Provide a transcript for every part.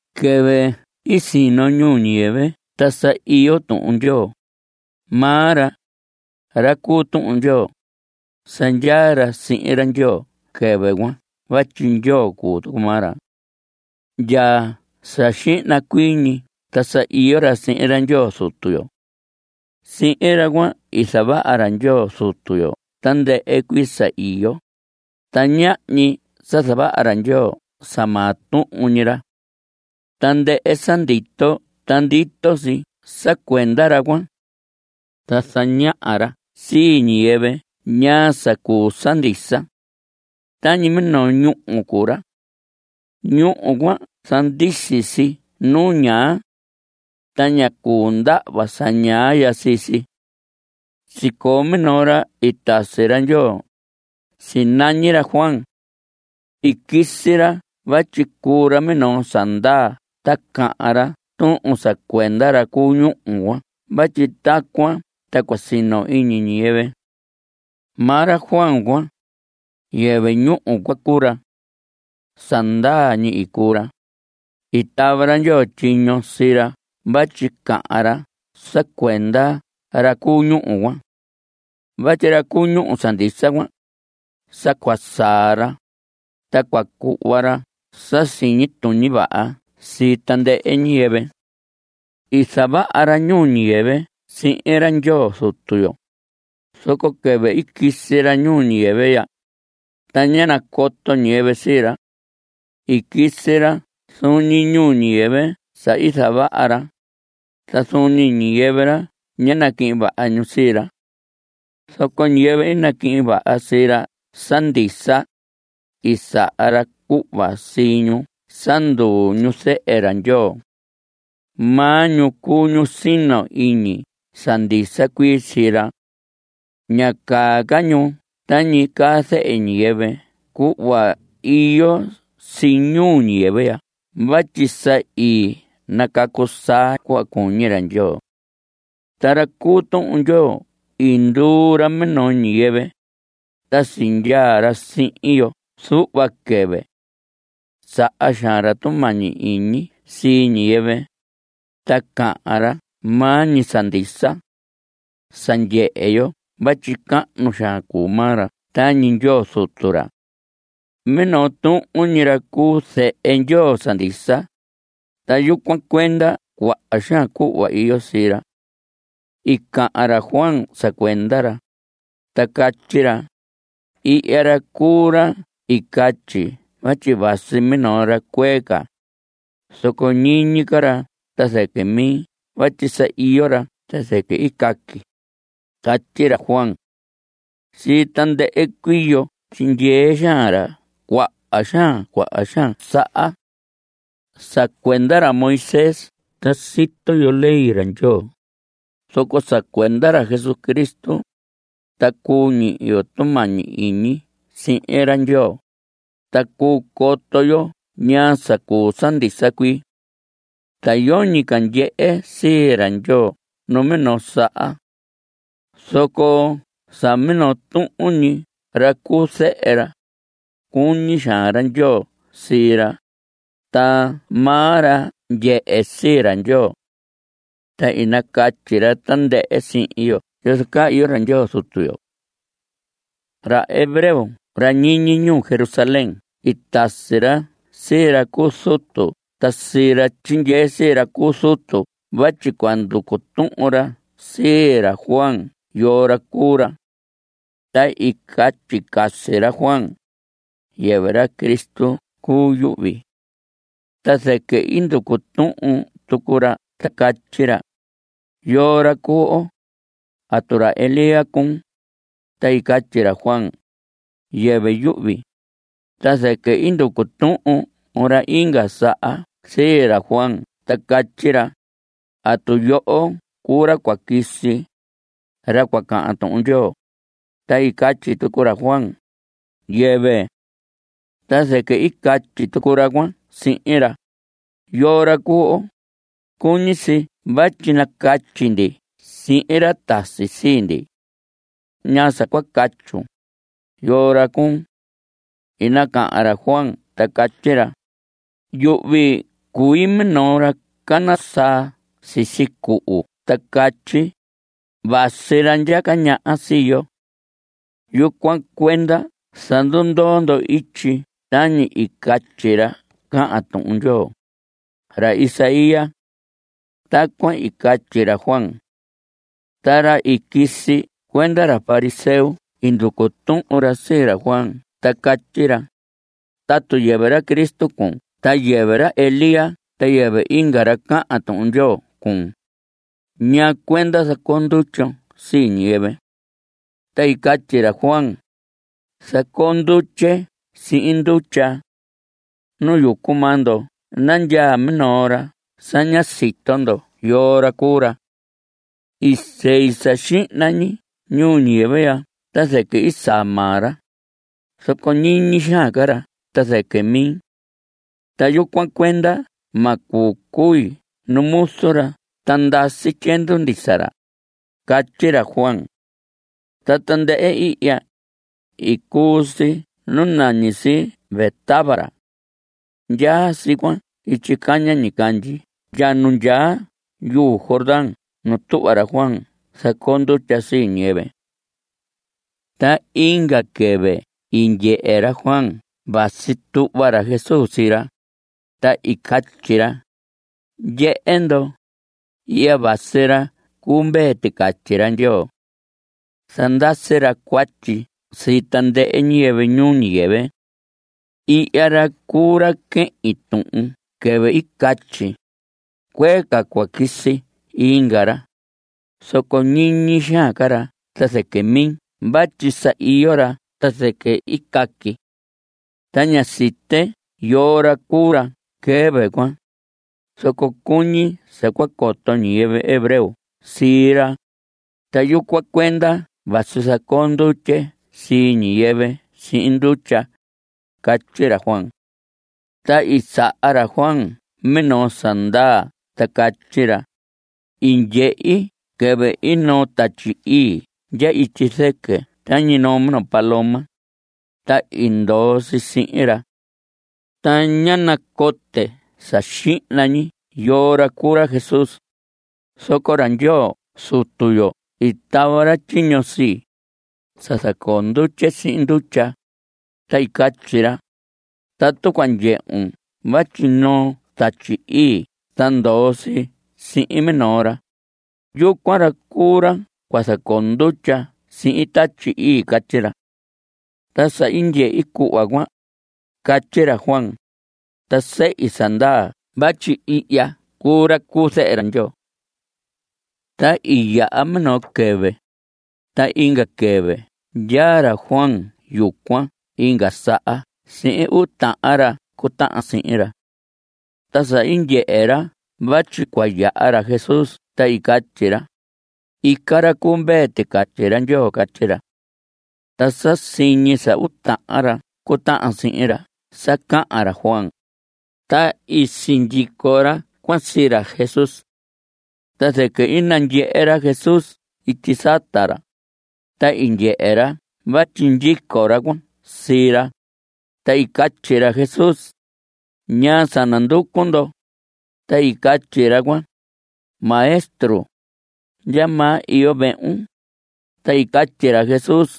Quɨvɨ i sino ñuu ñiyɨvɨ ta sa iyo Tuhun Ndyoo; maa ra, ra cu Tuhun Ndyoo, sa ndyaa ra sihin ra Ndyoo quɨvɨ cuan vatyi Ndyoo cuu tucu maa ra. Ndya sa xihna cuii ñi ta sa iyo ra sihin ra Ndyoo Zutu yo. Sihin ra cuan i zavaha ra Ndyoo Zutu yo tandɨhɨ cuii sa iyo, ta ñahñi sa zavaha ra Ndyoo sa maa tuhun ñi ra. Tandɨhɨ sa ndito ta ndito si sa cuenda ra cuan. Ta zañaha ra sii ñiyɨvɨ ñaa sa cuu sa ndisa. Tañi minoo ñúhu cuu ra. Ñúhu cuan zandisi si nu ñaa. Ta ña cuu ndahva sa ñaa ya sii si. Sicoo minoo ra i tasi ra Ndyoo. Sinañi ra Juan. I quisi ra vatyi cuu ra minoo sa ndaa ta cahan ra tuhun sa cuenda ra cu ñúhu cuan vatyi tacuan ta cua sino iñi ñiyɨvɨ. Maa ra Juan cuan, yɨvɨ ñúhu cuan cuu ra. Sa ndaa ñi i cuu ra. I tava ra Ndyoo tyiño sii ra vatyi cahan ra sa cuenda ra cu ñúhu cuan. Vatyi ra cu ñúhu sa ndisa cuan, sa cua saa ra, ta cua cuhva ra sa siñi tuñi vaha sii tandɨhɨ ñiyɨvɨ. I zavaha ra ñuu ñiyɨvɨ sihin ra Ndyoo Zutu yo, zoco quɨvɨ i quisi ra ñuu ñiyɨvɨ ya, ta ñá nacoto ñiyɨvɨ sii ra. I quisi ra zuun ñi ñuu ñiyɨvɨ sa i zavaha ra, ta zuun ñi ñiyɨvɨ ra ñá naquihin vaha ñu sii ra. Zoco ñiyɨvɨ i naquihin vaha sii ra sa ndisa, i saha ra cuhva sii ñu sa nduu ñu zehe ra Ndyoo. Maa ñu cuu ñu sino iñi sa ndisa cuii sii ra. Ña caa ca ñu tañi caa zehe ñiyɨvɨ cuhva iyo si ñuu ñiyɨvɨ ya vatyi sa i nacacu saa ñu cuhva cuñi ra Ndyoo. Ta ra cu Tuhun Ndyoo i nduu ra minoo ñiyɨvɨ, ta sindyaa ra sihin yo zuhva quɨvɨ. Saha xaan ra tumañi iñi sii ñiyɨvɨ, ta cahan ra maa ñi sa ndisa. Sa ndyehe yo vatyi cahnu xaan cuu maa ra tañi Ndyoo zutu ra. Minoo tuhun ñi ra cuu zehe Ndyoo sa ndisa, ta yucuan cuenda cuaha xaan cuhva iyo sii ra. I cahan ra Juan sa cuenda ra, ta catyi ra: Ihya ra cuu ra i catyi vatyi vasi minoo ra cuee ca, zoco ñiñi ca ra ta zɨquɨ mi vatyi sa iyo ra ta zɨquɨ i caqui. Catyi ra Juan. Sii tandɨhɨ cuii yo tyindyee xaan ra cuaha xaan cuaha xaan saha. Sa cuenda ra Moisés ta sito yo ley ra Ndyoo, zoco sa cuenda ra Jesucristo, ta cuu ñihi yo tumañi iñi sihin ra Ndyoo, ta cuu coto yo ñaa sa cuu sa ndisa cuii. Ta yoñi ca ndyehe sii ra Ndyoo numinoo saha. Zoco sa minoo tuhun ñi ra cuu zehe ra, cuñi xaan ra Ndyoo sii ra, ta maa ra ndyehe sii ra Ndyoo. Ta i nacatyi ra tandɨhɨ sihin yo yozo caa iyo ra Ndyoo Zutu yo. Ra hebreo ra ñiñi ñuu Jerusalén i tasi ra sii ra cu zutu ta sii ra tyindyee sii ra cu zutu vatyi cua nducu tuhun ra sii ra Juan yoo ra cuu ra. Ta i catyi casi ra Juan: Yɨvɨ ra Cristo cuu yuhvi. Ta zɨquɨ i nducu tuhun tucu ra ta catyi ra: ¿Yoo ra cuu oo? ¿Atu ra Elías cuun? Ta i catyi ra Juan: Yɨvɨ yuhvi. Ta zɨquɨ i nducu tuhun ra inga saha sii ra Juan ta catyi ra: ¿Atu yoho cuu ra cua quisi, ra cua cahan Tuhun Ndyoo? Ta i catyi tucu ra Juan: Yɨvɨ. Ta zɨquɨ i catyi tucu ra cuan sihin ra: ¿Yoo ra cuu oo? Cuñi si vatyi nacatyi ndi sihin ra tasi sii ndi. ¿Ñaa sa cua catyun? ¿Yoo ra cuun? I nacahan ra Juan ta catyi ra: Yuhvi cui minoo ra cana saa sisi cuhu ta catyi: “Vasi ra ndyaca ñaha sii yo. Yucuan cuenda zandundoo ndo ityi tañi i catyi ra cahan Tuhun Ndyoo”, ra Isaías. Tacuan i catyi ra Juan. Ta ra i quisi cuenda ra fariseo i nducu tuhun ra sii ra Juan ta catyi ra: Tatu yɨvɨ ra Cristo cuun ta yɨvɨ ra Elías ta yɨvɨ inga ra cahan Tuhun Ndyoo cuun ¿ñaa cuenda zacoo ndutyon sii ñiyɨvɨ? Ta i catyi ra Juan: Zacoo ndutye sihin ndutya. Nu yucu maa ndo nandyaa minoo ra sa ña sito ndo yoo ra cuu ra. I sei sa xihna ñi ñuu ñiyɨvɨ ya ta zɨquɨ i saa maa ra, zoco ñiñi xaan ca ra ta zɨquɨ mi. Ta yucuan cuenda ma cuu cui nu muzu ra ta ndasi tyiendu ndisa ra. Catyi ra Juan. Ta tandɨhɨ ihya, i cuu si nu nañi si Betábara. Ndyaa si cuan ityi caña ñicandyi ndya nu ndyaa yuu Jordán nu tuhva ra Juan zacoo ndutya sii ñiyɨvɨ. Ta inga quɨvɨ i ndyehe ra Juan vatyi tuhva ra Jesús sii ra, ta i catyi ra: Ndyehe ndo, ihya vasi ra cuu mvee ticatyi ra Ndyoo. Zandasi ra cuatyi sii tandɨhɨ ñiyɨvɨ ñuu ñiyɨvɨ. Ihya ra cuu ra quehin tuhun quɨvɨ i catyi: “Cuee ca cua quisi inga ra, zoco ñiñi xaan ca ra ta zɨquɨ mi vatyi sa iyo ra ta zɨquɨ i caqui.” Ta ñá site yoo ra cuu ra quɨvɨ cuan, zoco cuñi sa cua coto ñiyɨvɨ hebreo sii ra, ta yucuan cuenda vasi zacoo ndutye sii ñiyɨvɨ sihin ndutya. Catyi ra Juan. Ta i saha ra Juan minoo sa ndaa ta catyi ra: I ndyehi quɨvɨ i noo Tatyi Ii ndya ityi zɨquɨ tañi noo minoo paloma, ta i ndoo si sihin ra. Ta ñá nacote sa xihna ñi yoo ra cuu ra Jesús, zoco ra Ndyoo Zutu yo i tava ra tyiño sii, sa zacoo ndutye sihin ndutya, ta i catyi ra: “Tatu cua ndyehun vatyi noo Tatyi Ii ta ndoo si sihin minoo ra, yucuan ra cuu ra cua zacoo ndutya sihin Tatyi Ii.” Catyi ra. Ta sa i ndyehi cuhva cuan, catyi ra Juan, ta sehi sa ndaa vatyi ihya cuu ra cuu zehe ra Ndyoo. Ta i yaha minoo quɨvɨ. Ta inga quɨvɨ ndyaa ra Juan yucuan inga saha sihin uu tahan ra cutahan sihin ra. Ta sa i ndyehe ra vatyi cua yaha ra Jesús ta i catyi ra: Ica ra cu mvee ticatyi ra Ndyoo. Catyi ra. Ta sa siñi sa uu tahan ra cutahan sihin ra sa cahan ra Juan, ta i sindyico ra cuan sii ra Jesús. Ta zɨquɨ i nandyehe ra Jesús ityi sata ra, ta i ndyehe ra vatyi ndyico ra cuan sii ra, ta i catyi ra Jesús: ¿Ñaa sa nanducu ndo? Ta i catyi ra cuan: Maestro, ¿ndyamaa iyo vehun? Ta i catyi ra Jesús: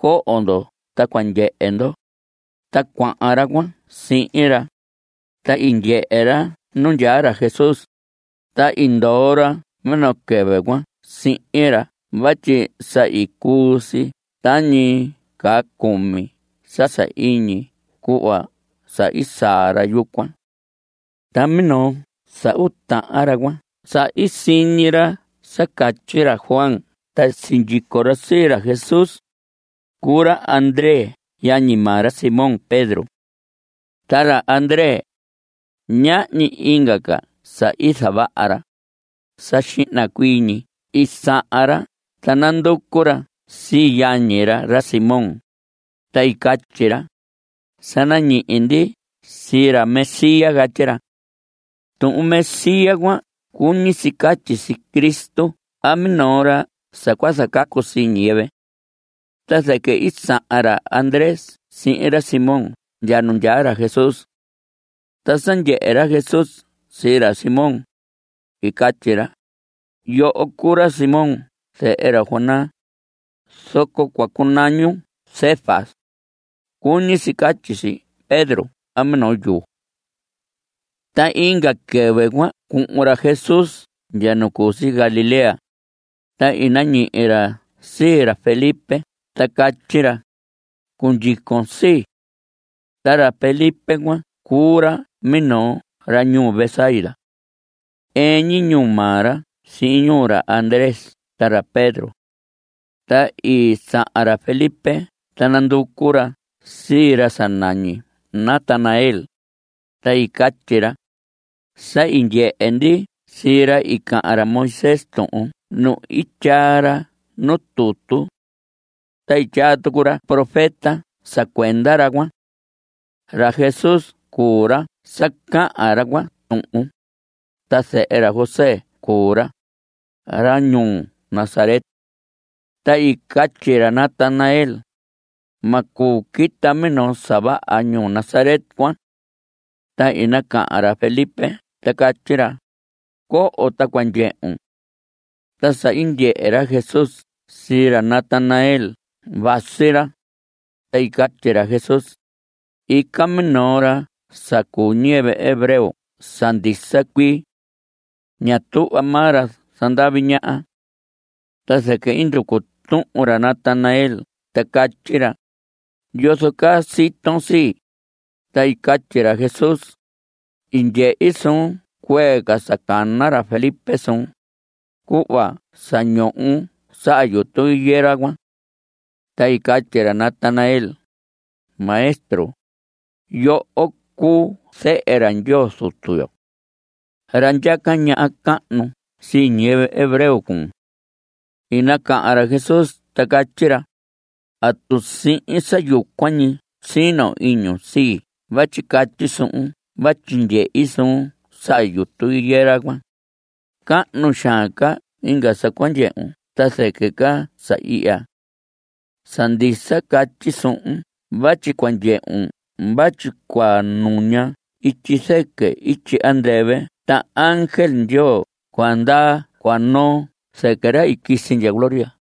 Coho ndo ta cua ndyehe ndo. Ta cuahan ra cuan sihin ra, ta i ndyehe ra nu ndyaa ra Jesús, ta i ndoo ra minoo quɨvɨ cuan sihin ra vatyi sa i cuu si tañi caa cumi sa sahiñi cuhva sa i saa ra yucuan. Ta minoo sa uu tahan ra cuan sa i siñi ra sa catyi ra Juan ta sindyico ra sii ra Jesús, cuu ra Andrés yañi maa ra Simón Pedro. Ta ra Andrés, ñahñi inga ca sa i zavaha ra. Sa xihna cuii ñi i sahan ra ta nanducu ra sii yañi ra, ra Simón, ta i catyi ra: Sa nañihi ndi sii ra Mesías. Catyi ra. (Tuhun Mesías cuan cuñi si catyi si Cristo a minoo ra sa cua zacacu sii ñiyɨvɨ.) Ta zɨquɨ i sahan ra Andrés sihin ra Simón ndya nu ndyaa ra Jesús. Ta sa ndyehe ra Jesús sii ra Simón, i catyi ra: Yoho cuu ra Simón zehe ra Jonás, zoco cua cunañun Cefas. (Cuñi si catyi si Pedro a minoo yuu.) Ta inga quɨvɨ cua cuhun ra Jesús ndya nu cu si Galilea, ta i nañihi ra sii ra Felipe ta catyi ra: Cundyicon sii. Ta ra Felipe cuan cuu ra minoo ra ñuu Betsaida. Ɨɨn ñi ñuu maa ra sihin ñuu ra Andrés ta ra Pedro. Ta i sahan ra Felipe ta nanducu ra sii ra sa nañi Natanael, ta i catyi ra: Sa i ndyehe ndi sii ra i cahan ra Moisés tuhun nu i tyaa ra nu tutu. Ta i tyaa tucu ra profeta sa cuenda ra cuan. Ra Jesús cuu ra sa cahan ra cuan tuhun, ta zehe ra José cuu ra, ra ñuu Nazaret. Ta i catyi ra Natanael: Ma cuu quita minoo sa vaha ñuu Nazaret cuan. Ta i nacahan ra Felipe ta catyi ra: Coho ta cua ndyehun. Ta sa i ndyehe ra Jesús sii ra Natanael vasi ra, ta i catyi ra Jesús: Ica minoo ra sa cuu ñiyɨvɨ hebreo sa ndisa cuii. Ña tuhva maa ra zandavi ñaha. Ta zɨquɨ i nducu tuhun ra Natanael ta catyi ra: ¿Yozo caa siton sii? Ta i catyi ra Jesús: I ndyehi suun cuee ca sa cana ra Felipe suun, cuhva sa ndyoon saha yutu higuera cuan. Ta i catyi ra Natanael: Maestro, yoho cuu zehe ra Ndyoo Zutu yo. Ra ndyaca ñaha cahnu sii ñiyɨvɨ hebreo cuun. I nacahan ra Jesús ta catyi ra: ¿Atu sihin sa yucuan ñi sino iñun sii vatyi catyi suhun vatyi ndyehi suun saha yutu higuera cuan? Cahnu xaan ca inga sa cua ndyehun ta zɨquɨ ca sa ihya. Sa ndisa catyi suhun vatyi cua ndyehun vatyi cua nuña ityi zɨquɨ ityi andɨvɨ ta ángel Ndyoo cua ndaa cua noo zɨquɨ ra i quisi ndya gloria.